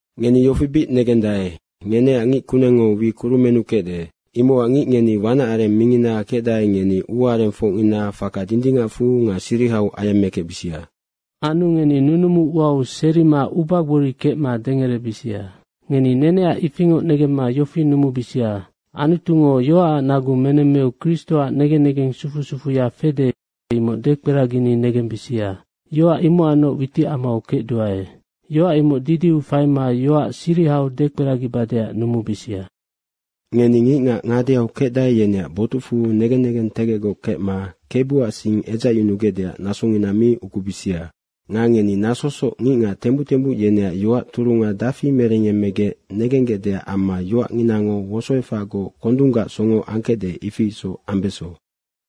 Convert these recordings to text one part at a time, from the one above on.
Ngeni yofi bic negendae, ngeneac ngic kunengngo wi kurumennu kecde. Imocac ngic ngeni wanac areng mingina kecdae, ngeni ua arengfocngina faka dindingacfu nga sirihau ayemmekecbisia. Anu ngeni nunumu uau serima ubagbori kecma dengerebisia. Ngeni neneac ifingoc negemma yofi numubisia: Anutungo yoacac nagu menemmeu Kristoac negen negeng sufu sufuya fede, imoc dekperagini negembisia. Yoac imocacnoc witicamau kecduae. Yoac imoc didiu faima yoac sirihau dekperagibadeac numubisia. Ngeni ngicngac ngadeau kecdae, yeneac botucfu negen negentegecgoc kecma Kebuac sing edzacyunugecdeac nasongina mi ukubisia. Nga ngeni nasosoc ngicngac tembuc tembuc yeneac yoac turunga dafi merengyemmegec negenggecdeac amma yoacnginango wosoefacgoc kondunggac songo angkecde, ifi isoc ambeso.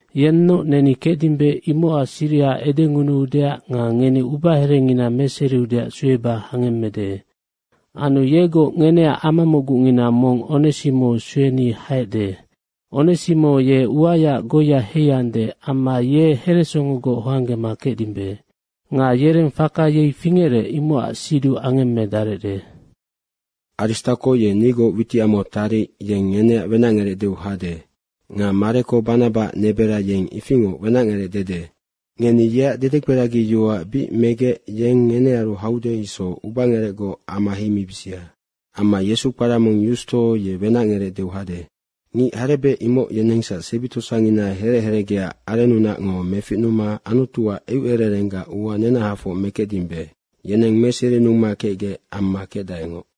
Yennoc neni kecdimbe imocac siriha edengunuudeac nga ngeni ubaherengina meseriudeac sueba hangemmede. Anu yegoc ngeneac amamocgungina mong, Onesimo, sueni haecde. Onesimo ye uayaac goiya heiande, amma ye heresongogoc hoanggema kecdimbe. Nga yereng faka yei fingerec, imocac siduc angemmedarecde. Nga Aristako ye nigoc witicamau taric, yeng ngeneac wenacngerec deu hade. Nga Mareko, Banabaac nebera yeng ifingoc wenacngerec dede. Ngeni yeac dedekperagiyoac bic megec, yeng ngenearu haude isoc ubangerecgoc ama heimibisia. Amma Yesu, kpara mong Yusto, ye wenacngerec deu hade. Ngic harebec imoc yenengsac sebi tosangina herec herecgeaac arennunacngo meficnuma Anutuac eucererenggac ua nenahafoc mekecdimbe. Yeneng meserinuma kecgec amma kecdaengoc.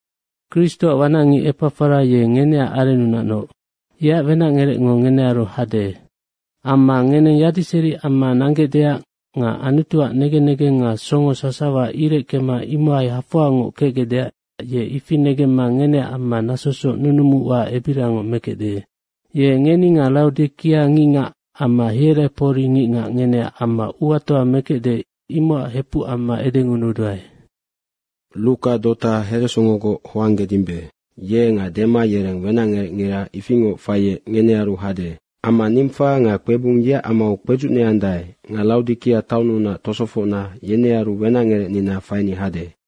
Kristoac wanacngic Epafara, ye ngeneac arennunacnoc, yeac wenacngerecngo ngenearu hade. Amma ngeneng yadiseri amma nanggecdeac nga Anutuac negen negeng nga songo sasawa ireckema imohai hafoangoc kecgecdeac, ye ifi negemma ngeneac amma nasosoc nunumu ua ebiriangoc mekecde. Ye ngeni nga Raodikea ngicngac amma Hierapori ngicngac ngeneac amma uatoa mekecde, imocac hepuc amma edengunuduae. Nga Ruka, dota heresongogoc hoanggedimbe, ye nga Dema, yereng wenacngerecngira ifingoc faiec ngenearu hade. Amma Nimfa nga kpebung yeac amau kpedzucneandae nga Raodikea taonnunac tosofocna yenearu wenacngerecnina faini hade.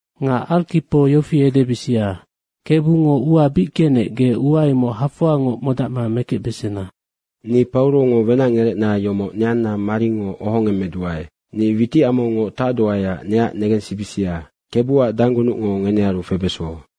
Nga Arkipo yofi edebisia, “Kebungo ua bic genec, ge ua imoc hafoangoc modacma mekecbesena.” Anu Pauro ni wenacngerecna yomoc neanna maringo ohongemmeduae. Nga witicamaungoc tacduaeac neac negensibisia. Kebuac danggunucngo ngenearu febeso.